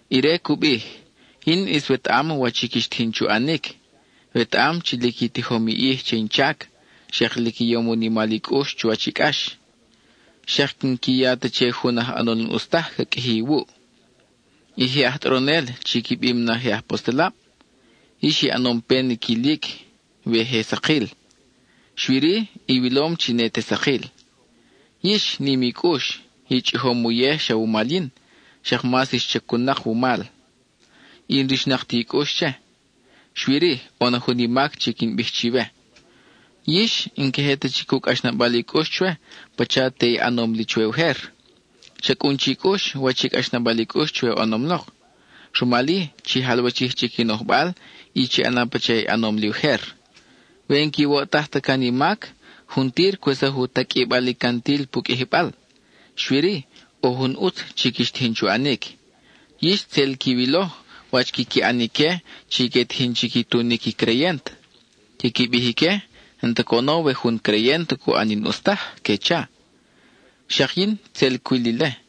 Ire cu bij: Yin ʼis wetaʼam wach i quix tijin chu ʼanic; wetaʼam chi lic i tijom i ʼij che in chac, xak lic i yom u nimal i cʼux chuwach i cʼax. Xak n-qui ya ta che jun aj ʼanol n-ʼus taj ca qʼuiji iwuʼ. I je aj tʼoronel chi qui bim na je apostelab, yix i ʼanom pen i quilic we je sakil, xui-ri iwilom chi ne te sakil. Yix, nim i cʼux; i chʼijom uyej xa wumal yin, xak mas ix chacun-nak wumal, y n-rixnak ti i cʼux che. Xui-ri, ʼo na jun i mac chi quin bij chiwe: yix, n-queje ta chic u cʼaxnabal i cʼux chwe pacha te i ʼanom li chwe ujer. Cha cʼun chi cʼux wach i cʼaxnabal i cʼux chwe oʼonom lok. Rumal-i, chi jalwachij chic i nojbal y chi ʼana pacha i ʼanom li ujer. We n-quiwoʼtaj ta can i mac, juntir cwesaj u taqʼuibal i cantil pu qʼuijibal. Xui-ri, ʼo jun ʼutz, chi quix tijin chu ʼanic: yix tzel quiwilo wach quiqui ʼan ique chi que tijin chi qui tunic i creyent. Quiqui bij ique n-ta coʼono we jun creyent cu ʼan i n-ʼus taj, que cha. Xak yin, tzel cwil ile.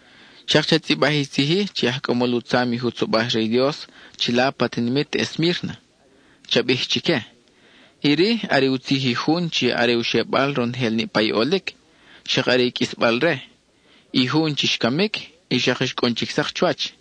Xak cha tzʼibaj i tzij-i che i aj cʼamol u tzam i jutzobaj re i Dios chila pa tinimit Esmírna; cha bij chique: “Iri are u tzij i jun chi are u xebal ronojel niʼpa i ʼolic, xak are i qʼuisbal-re; i jun chi xcamic, y xak xcʼun chic sak chuwach.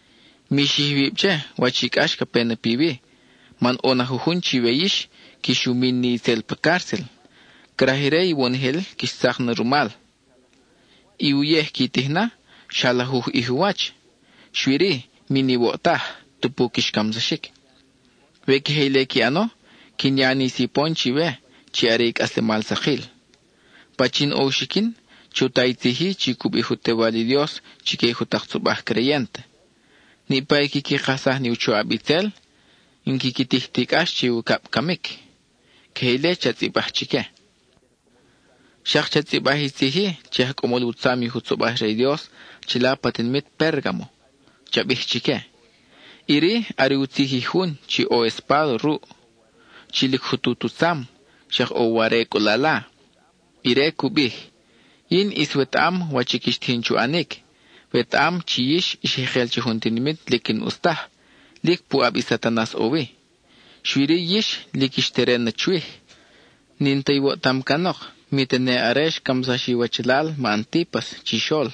Mi xij iwib che wach i cʼax ca pe na piwi, man ʼo na jujun chiwe yix, quix u min ni itzel pa cárcel; craj ire iwonojel quix tzak na rumal. I uyej qui tij na, xa lajuj ʼij u wach, xui-ri, min iwoʼtaj, tupu quix camsaxic. We queje ile qui ʼano, quin ya ni sipon chiwe, chi are i cʼaslemal sakil. Pachin ʼo u xiquin, chu ta i tzij-i chi cu bij u Tewal i Dios chique i jutak tzobaj creyent: Niʼpa i quiqui kajsaj ni u choʼab itzel, n-quiqui tij ti cʼax che i ucab camic”. (Queje ile cha tzʼibaj chique.) Xak cha tzʼibaj i tzij-i che i aj cʼamol u tzam i jutzobaj re i Dios chila pa tinimit Pérgamo; cha bij chique: “Iri are u tzij i jun chi ʼo i espáda ruʼ, chi lic jutut u tzam, xak ʼo u ware cʼulala. Ire cu bij: Yin ʼis wetaʼam wach i quix tijin chu ʼanic; wetaʼam chi yix ix jekel che jun tinimit lic n-ʼus taj, lic puʼab i Satanas ʼo wi. Xui-ri yix lic ix teren na chwij; n-in ta iwoʼtam canok, mi tene are xcamsax iwachalal ma Antípas chixol.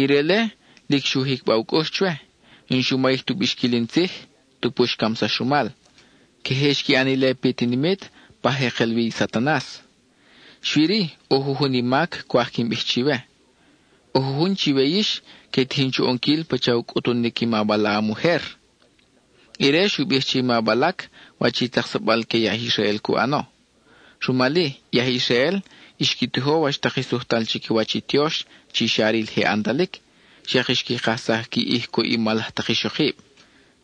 Ire-le, lic xu jicba u cʼux chwe; n-xu mayij tu bixquil in tzij, tupu xcamsax rumal. Queje xqui ʼan ile pi tinimit, pa jekel wi i Satanas. Xui-ri, ʼo jujun i mac cwaj quin bij chiwe: ʼo jujun chiwe yix que tijin chu ʼonquil pacha u cʼutunic i ma Balaam ujer. Ire xu bij che i ma Balac wach i tzaksabal que i aj Israel cu ʼano. Rumal-i, i aj Israel xqui tijo wach tak i sujtal chiquiwach i tiox chi xa ril je ʼantalic, xak xqui kajsaj qui ʼij cuʼ i mal laj tak ixokib.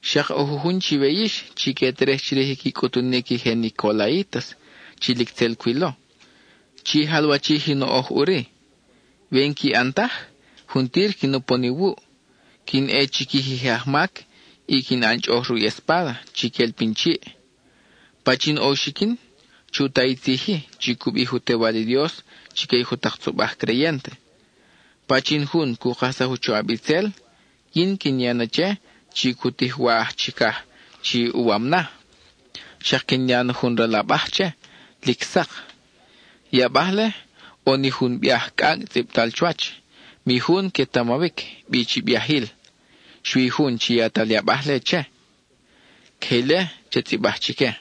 Xak ʼo jujun chiwe yix chi que terej chirij qui cʼutunic i je nicolaítas, chi lic tzel cwilo. Chi jalwachij i noʼoj ʼuri. We n-qui ʼan taj, juntir quin upon iwuʼ; quin ʼe chiquij i je ajmac, y quin ʼan chʼoʼoj ruʼ i espáda chi quel pin chiʼ. Pachin ʼo u xiquin, chu ta i tzij-i chi cu bij u Tewal i Dios chique i jutak tzobaj creyent: Pachin jun cu kajsaj u choʼab itzel, yin quin ya na che chi cu tij i wa aj chicaj chi uwam na; xak quin ya na jun ral abaj che, lic sak. I abaj-le, ʼo ni jun biaj cʼacʼ tzʼibtal chuwach; mi jun quetamawic bi chi biajil, xui i jun chi yatal i abaj-le che.” (Queje ile cha tzʼibaj chique.)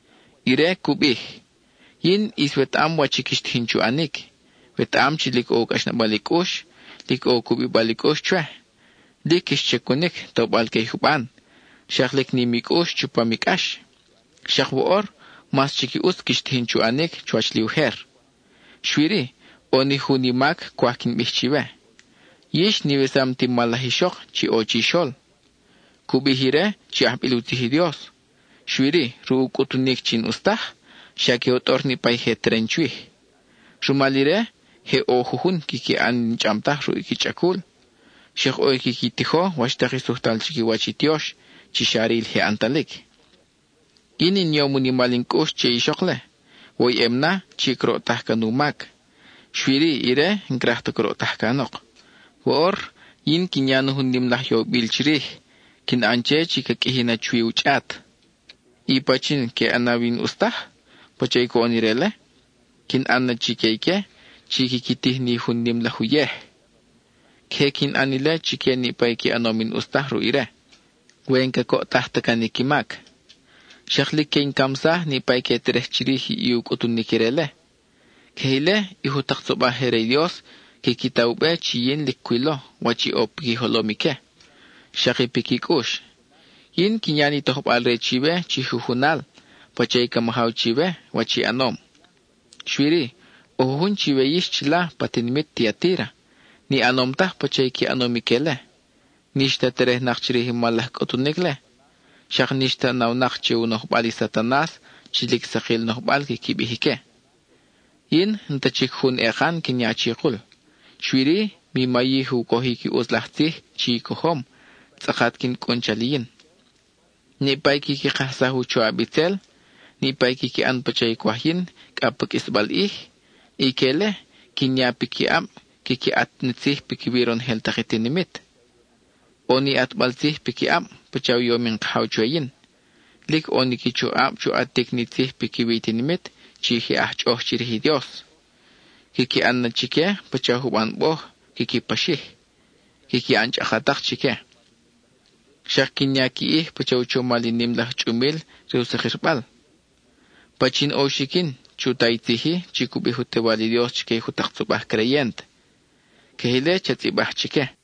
Ire cu bij: Yin ʼis wetaʼam wach i quix tijin chu ʼanic; wetaʼam chi lic ʼo u cʼaxnabal i cʼux, lic ʼo u cubibal i cʼux chwe; lic quix chacunic tobal que i juban, xak lic nim i cʼux chupam i cʼax. Xak woʼor mas chic i ʼutz quix tijin chu ʼanic chuwach li ujer. Xui-ri, ʼo ni jun i mac cwaj quin bij chiwe: yix n-iwesam ti mal laj ixok chi ʼo chixol. Cu bij ire chi ajbil u tzij i Dios, xui-ri, ruʼ u cʼutunic chi n-ʼus taj, xa que u tʼor niʼpa i je teren chwij. Rumal ire, je ʼo jujun quiqui ʼan i n-chʼam taj ruʼ i qui chʼacul; xak ʼo i quiqui tijo wach tak i sujtal chiquiwach i tiox chi xa ril je ʼantalic. Yin in yom u nimal in cʼux che i ixok-le, woyʼem na chi croʼtaj can u mac. Xui-ri ire n-craj ta croʼtaj canok. Woʼor, yin quin ya na jun nim laj yobil chirij; quin ʼan che chi ca qʼuiji na chuwi u chʼat. I pachin i que ʼanaw i n-ʼus taj, pacha i coʼon ire-le, quin ʼan na chique ique chi quiqui tij ni jun nim laj uyej. Queje quin ʼan ile chique niʼpa i qui ʼanom i n-ʼus taj ruʼ ire, we n-cacoʼtaj ta can i qui mac. Xak lic que in camsaj niʼpa i que terej chirij i u cʼutunic ire-le. Queje ile, i jutak tzobaj je re i Dios quiqui ta u be chi yin lic cwilo wach i ʼo piqui jolom ique, xak i piqui cʼux. Yin quin ya ni tojbal-re chiwe chi jujunal, pacha i ca majaw chiwe, wach i ʼanom. Xui-ri, ʼo jujun chiwe yix chila pa tinimit Tiatíra, ni ʼanom taj pacha i qui ʼanom ique-le. N-ix ta terejnak chirij i mal laj cʼutunic-le; xak n-ix ta nawnak che u nojbal i Satanas chi lic sakil nojbal quiqui bij ique. Yin, n-ta chic jun ekan quin ya chikul, xui-ri, mi mayij u cojic i ʼutz laj tzij chi i cojom, tzʼakat quin cʼun chal i yin. Niʼpa i quiqui kajsaj u choʼab itzel, niʼpa i quiqui ʼan pacha i cwaj yin cʼa pa qʼuisbal ʼij, ique-le, quin ya piquiʼab quiqui ʼat ni tzij piquiwi ronojel tak i tinimit. ʼO ni ʼatbal tzij piquiʼab pacha u yom in Kajaw chwe yin. Lic ʼo ni qui choʼab chu ʼatic ni tzij piquiwi i tinimit chi je aj chʼoʼoj chirij i Dios. Quiqui ʼan na chique pacha juban boj quiqui paxij; quiqui ʼan chʼakatak chique. Xak quin ya qui ʼij pacha u chomal i nim laj chʼumil re u sakirbal. Pachin ʼo u xiquin, chu ta i tzij-i chi cu bij u Tewal i Dios chique i jutak tzobaj creyent.” (Queje ile cha tzʼibaj chique.)